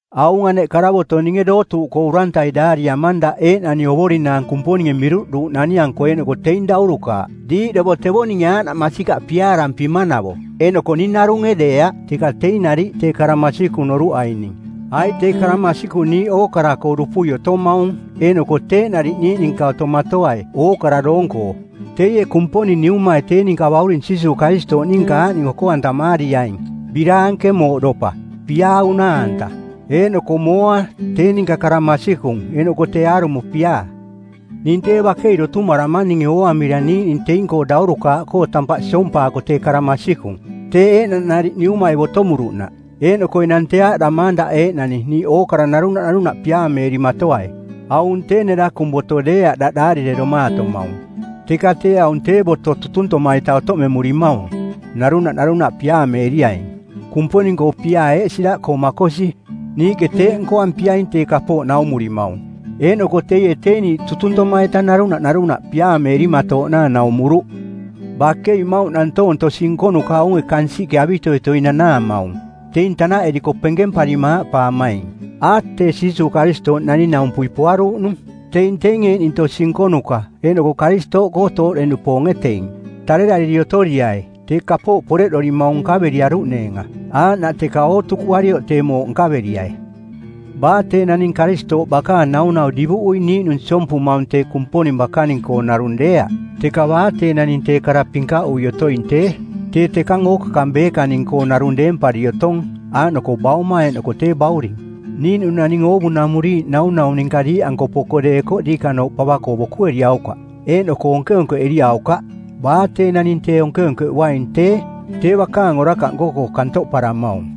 Aung aneꞌ karavoto˜ ninge dootuuꞌkoo urantai daariamang daꞌ eeꞌnani ovorinaang Kumponinge miruꞌduuꞌnani-anko eeꞌnoko teing daurukaaꞌ. Diiꞌdovo tevo ninge aaꞌnaꞌ masikaꞌ piaarampimanavo eeꞌnoko ning narunge deeaꞌ, teka teing nariꞌ tee kara masikung noruꞌaining, aiꞌ tee kara masikung niiꞌ ookara-koo dupui otomaung eeꞌnoko teeꞌ nariꞌ niiꞌ ninka otomatoai ookara doong-koo. Teie Kumponing Niumai tee ninka Bauring Jiisuuꞌ Karistooꞌ ninka aaꞌning oko-antamaariaing: biraanke mooꞌdopa, piaa unaa-anta, eeꞌnoko mooa, tee ninka kara masikung eeꞌnoko tee aarumo piaa. Ning tee bakei dotumaramang ninge ooaramira niiꞌning teing-koo daurukaaꞌkoo tampaꞌ siompaako tee kara masikung, teeꞌ eeꞌnaꞌ nariꞌ Niumai botomuruꞌnaꞌ. Eeꞌnoko enang tee aaꞌdamaang daꞌ eeꞌnani, niiꞌ ookara narunaꞌ narunaꞌ piaameerimatoai. Aung tee nerakung boto deeaꞌ daꞌ daarireromaatomaung, teka tee aung tee boto tutuntoma-ita otoꞌmemurimaung: Narunaꞌ narunaꞌ piaameeriaing. Kumponing-koo piaa eeꞌ siraꞌkoo makosi: Niiꞌke teeꞌ nkoampiaing tee kapooꞌ naumurimaung. Eeꞌnoko teie tee niiꞌ tutuntoma-ita narunaꞌ narunaꞌ piaameerimatooꞌnaang naumuruꞌ. Bakei, mmauꞌ nantoong tosi nkonuka aunge kansiꞌke avitoitoi nanaamaung, teing tanaꞌeriko penkemparima aaꞌpaamaing, “A, tee Jiisuuꞌ Karistooꞌ naning-naumpui poaruuꞌnung.” Teing teing eeꞌning tosi nkonuka eeꞌnoko Karistooꞌkoo tooꞌde-nupoonge teing. Tarerariri otoriai tee kapooꞌ poreꞌdorimaung nkaveriaruꞌneenga, aaꞌnaꞌ teka ootukuarioꞌ tee mooꞌ nkaveriai. Baa tee naning Karistooꞌ bakaang naunau divuꞌui niiꞌnung siompumaung tee Kumponing bakaning-koo narung deeaꞌ, teka baa tee naning tee kara pinkaꞌui otoing tee, tee tekang ookakang beekaning-koo narung deempari otong aaꞌnoko Bauma eeꞌnoko tee Bauring. Niiꞌnung naning oovunamuriiꞌ naunau ninka diiꞌanko poko deekoꞌ diikanooꞌ pava-koo bokueriaukaꞌ, eeꞌnoko onkeonkeꞌeriaukaꞌ. Baa tee naning tee onkeonkeꞌuaing tee, tee bakaang orakaꞌ nko-koo kantoꞌparamaung.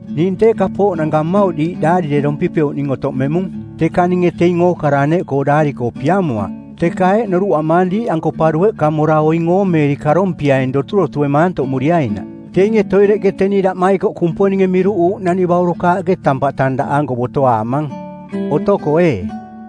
Ning tee kapooꞌnanka mmauꞌ diiꞌ daarirerompipeuꞌning otoꞌmemung, teka ninge teing ookara aneꞌkoo daari-koo piamoaꞌ. Teka eeꞌ noruꞌamaang diiꞌanko pa dueꞌka mora oing oomeeri karompiaing doturotue maantoꞌmuriainaꞌ. Teinge toireꞌke teni daꞌmaikoꞌ Kumponinge miruꞌuuꞌnani baurukaaꞌke tampaꞌ tang daꞌanko botoaamang. Otoko, ee.